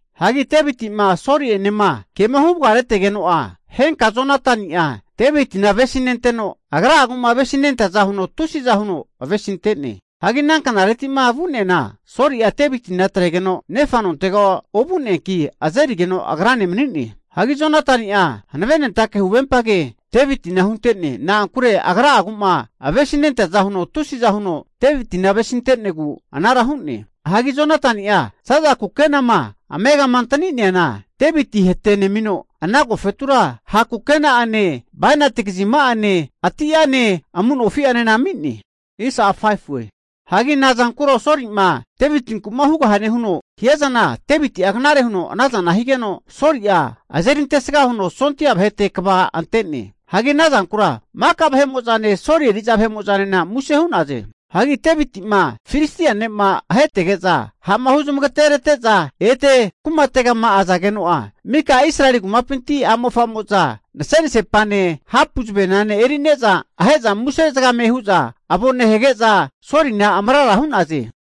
Hagi Deviti'ma Soli'enema ke'ma huvagaretegeno'a, henka Jonatani'a Devitina avesinenteno, agra'agu'ma avesinenteaza huno tusiza huno avesinte'ne. Hagi ana knareti'ma vu'neana Soli'a Devitina atregeno nefa nontega ovu'neanki, azerigeno agrane mani'ne. Hagi Jonatani'a hanavenentake huvempage Devitina hunte'ne. Na'ankure agra'aguma avesinenteaza huno tusiza huno Devitina avesinte'negu anara hu'ne. Hagi Jonatani'a za'za kukenama amegama antani'neana, Deviti hatenemino, ana agofetura ha' kukena'ane, bainati kazima'ane ati'ane amu nofi'anena ami'ne. Hagi nazankuro Soli'ma Devitinku'ma hugahane huno hiazana Deviti'a knare huno anazana higeno, Soli'a azeri antesga huno sondia vahete kva ante'ne. Hagi ana zankura maka vahe'mo'zane Soli eri'za vahe'mo'zanena muse hu'naze. Hagi Deviti'ma Filistia ne'ma ahetege'za ha'ma huzmagaterete'za ete kumategama azageno'a, maka Israeli kumapinti a'mofa'mo'za nasenasepane, hapu zavenane eri'za ahe'za muse hu'za avo nehage'za Solina amarara hu'naze.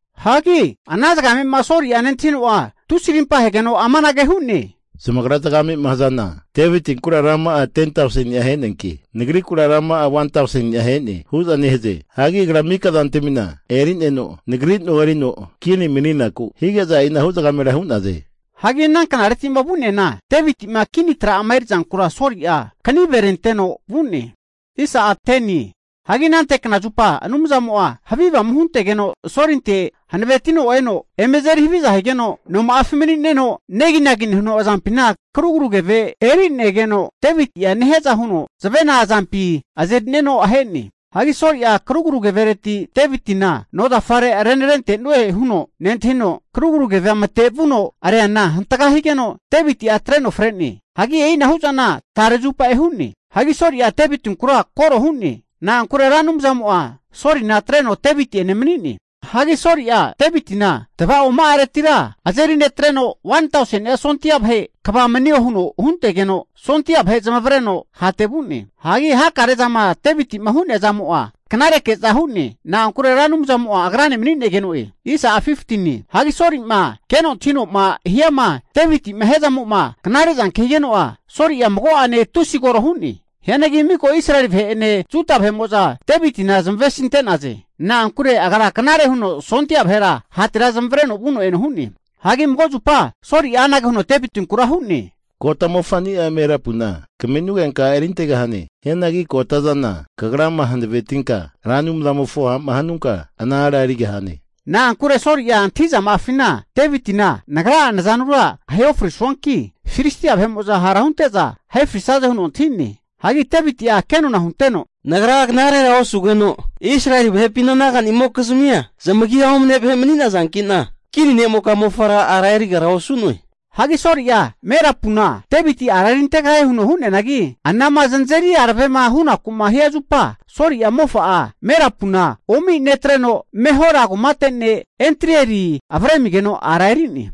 Hagi ana zagamema Soli'a nentahino'a, tusi arimpa ahegeno amanage hu'ne, Zamagra zagamema hazana Devitinkura rama'a 10tauseni'a aheneanki, nagrikura 1tauseni'a ahene hu'za nehaze. Hagi agra maka zantamina erineno, nagri no erino kini mani'naku hige'za e'inahu zagamera hu'naze. Hagi ana knareti'ma vu'neana Deviti'ma kini tra'ama erizanku Soli'a kaniverenteno vu'ne. Hagi anante knazupa Anumzamo'a havi avamu huntegeno Solintera hanavetino eno eme azeri haviza higeno, noma'afi mani'neno neginagi nehuno azampina karugru keve e'rinegeno, Deviti'a nehiaza huno zavena azampi azeri'neno ahe'ne. Hagi Soli'a karugru kevereti Devitina nozafare renarente'nue huno nentahino, karugru keve matevuno reana hantaga higeno, Deviti'a atreno fre'ne. Hagi e'inahu'zana tare zupa hu'ne. Hagi Soli'a Devitinkura koro hu'ne. Na'ankure Ra Anumzamo'a Solina atreno Deviti'ene mani'ne. Hagi Soli'a Devitina tavaoma'aretira azeri netreno 1tauseni'a sondia vahe kva manio huno huntegeno, sondia vahe zamavareno hate vu'ne. Hagi hakarezama Deviti'ma hu'nea zamo'a knare ke'za hu'ne. Na'ankure Ra Anumzamo'a agrane mani'negeno'e. Hagi Soli'ma keno antahino'ma hiama Deviti'ma hiazamo'ma knare zanke higeno'a, Soli'a mago'ane tusi koro hu'ne. Hianagi miko Israeli vahe'ene Juda vahe'mo'za Devitina zamavesinte'naze. Na'ankure agra knare huno sondia vahera hatera zamavareno vuno eno hu'ne. Hagi mago zupa Soli'a anage huno Devitinkura hu'ne, Kota mofa'ni'a Merapuna kaminugenka a' erintegahane. Hianagi kotazana kagrama hanavetinka Ra Anumzamofo ha'ma hanunka, ana ara erigahane. Na'ankure Soli'a antahi'zama'afina Devitina nagra'a nazanura ahe ofrisuanki, Filistia vahe'mo'za hara hunte'za ahe frisaze huno antahi'ne. Hagi Deviti'a kenona hunteno, Nagra knarera osugeno, Israeli vahepina naga'nimokizmia zamagia omane vahe mani'nazanki'na, kini ne'moka mofara ara erigara osu'noe. Hagi Soli'a Merapuna Deviti ara erintegahie huno hu'neanagi, anama zanazeri aravema hunaku'ma hia zupa, Soli'a mofa'a Merapuna omi netreno, Mehola kumate ne' Adrieli avremigeno ara eri'ne.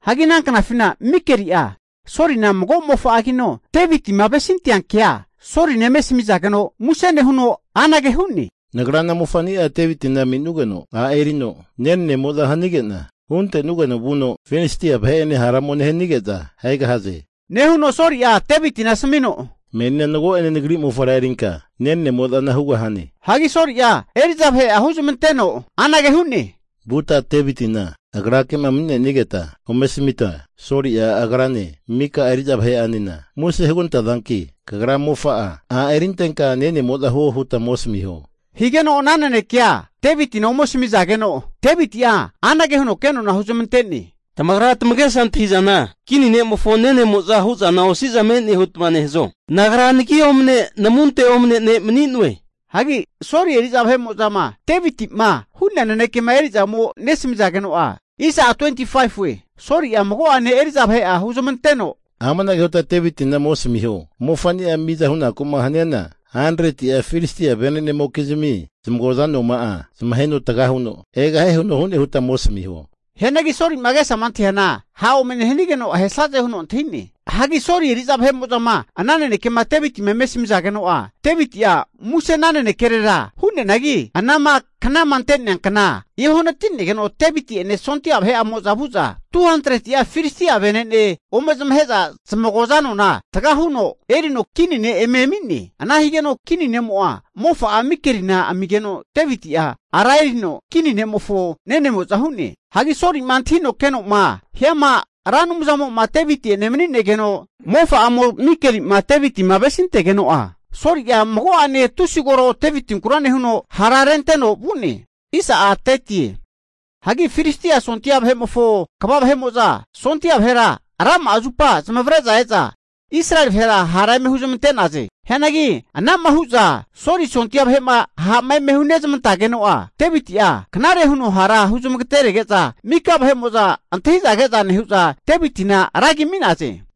Hagi ana knafina Mikeli'a Solina mago mofa'agino, Devitima avesintea kea Solina eme asamizageno'a muse nehuno, Anage hu'ne, nagra ana mofania Devitina aminugeno ara erino, nenanemo'zana hanige'na, huntenugeno vuno Filistia vahe'ene hara ome nehanige'za ahegahaze. Nehuno Soli'a Devitina asamino, Menina mago'ene nagri mofara erinka nenanemo'zana hugahane. Hagi Soli'a eri'za vahe'a huzamanteno anage hu'ne, vuta Devitina agrake'ma mani'nenigeta ome asamita, Soli'a agrane mika eri'za vahe'anena muse hugantazanki, kagra mofa'a a' erintenka nenemo'za huo huta ome asamiho. Higeno ana nenekea Devitina ome asamizageno, Deviti'a anage huno kenona huzamante'ne, Tamagra tamagesa antahi'zana kini ne'mofo nenemozama hu'zana osi'za me'ne hutma nehazo? Nagra nagi omne namunte omane ne' mani'noe. Hagi Soli eri'za vahe'mo'zama Deviti'ma hu'nea nanekema eri'za ome nesamizageno'a, Soli'a mago'ane eri'za vahe'a huzamanteno, amanage huta Devitina ome asamiho, Mofanima mizama hunaku'ma haniana 100'a Filistia venenemokizmi zamagoza anoma'a zamaheno taga huno egahie huno hu'ne huta ome asamiho. Hianagi Solima agesama antahiana ha' ome nehanigeno ahesaze huno antahi'ne. Hagi Soli eri'za vahe'mo'zama ana nanekema Devitima eme asamizageno'a Deviti'a muse ana nanekerera hu'neanagi, anama knama ante'nea kna eohanati'negeno, Deviti'ene sondia vahe'amo'za vu'za 200'a Filistia vene'ne ome zamahe'za, zamagoza anona taga huno erino kini ne' eme ami'ne. Ana higeno kini ne'mo'a mofa'a Mikelina amigeno Deviti'a ara erino kini ne'mofo nenemo'za hu'ne. Hagi Soli'ma antahino kenoma hiama Ra Anumzamo'ma Deviti'ene manigeno, mofa'amo Mikeli'ma Devitima avesintegeno'a, Soli'a mago'ane tusi koro Devitinkura nehuno, hara renteno vu'ne. Hagi Filistia sondia vahe'mofo kva vahe'mo'za sondia vahera rama'a zupa zamavare'za e'za Israeli vahera hara eme huzamante'naze. Hianagi ana'ma hu'za Soli sondia vahe'ma ha'ma eme hunezamantageno'a, Deviti'a knare huno hara huzamagatenerege'za maka vahe'mo'za antahi'za ke'za nehu'za, Devitina ra agi ami'naze.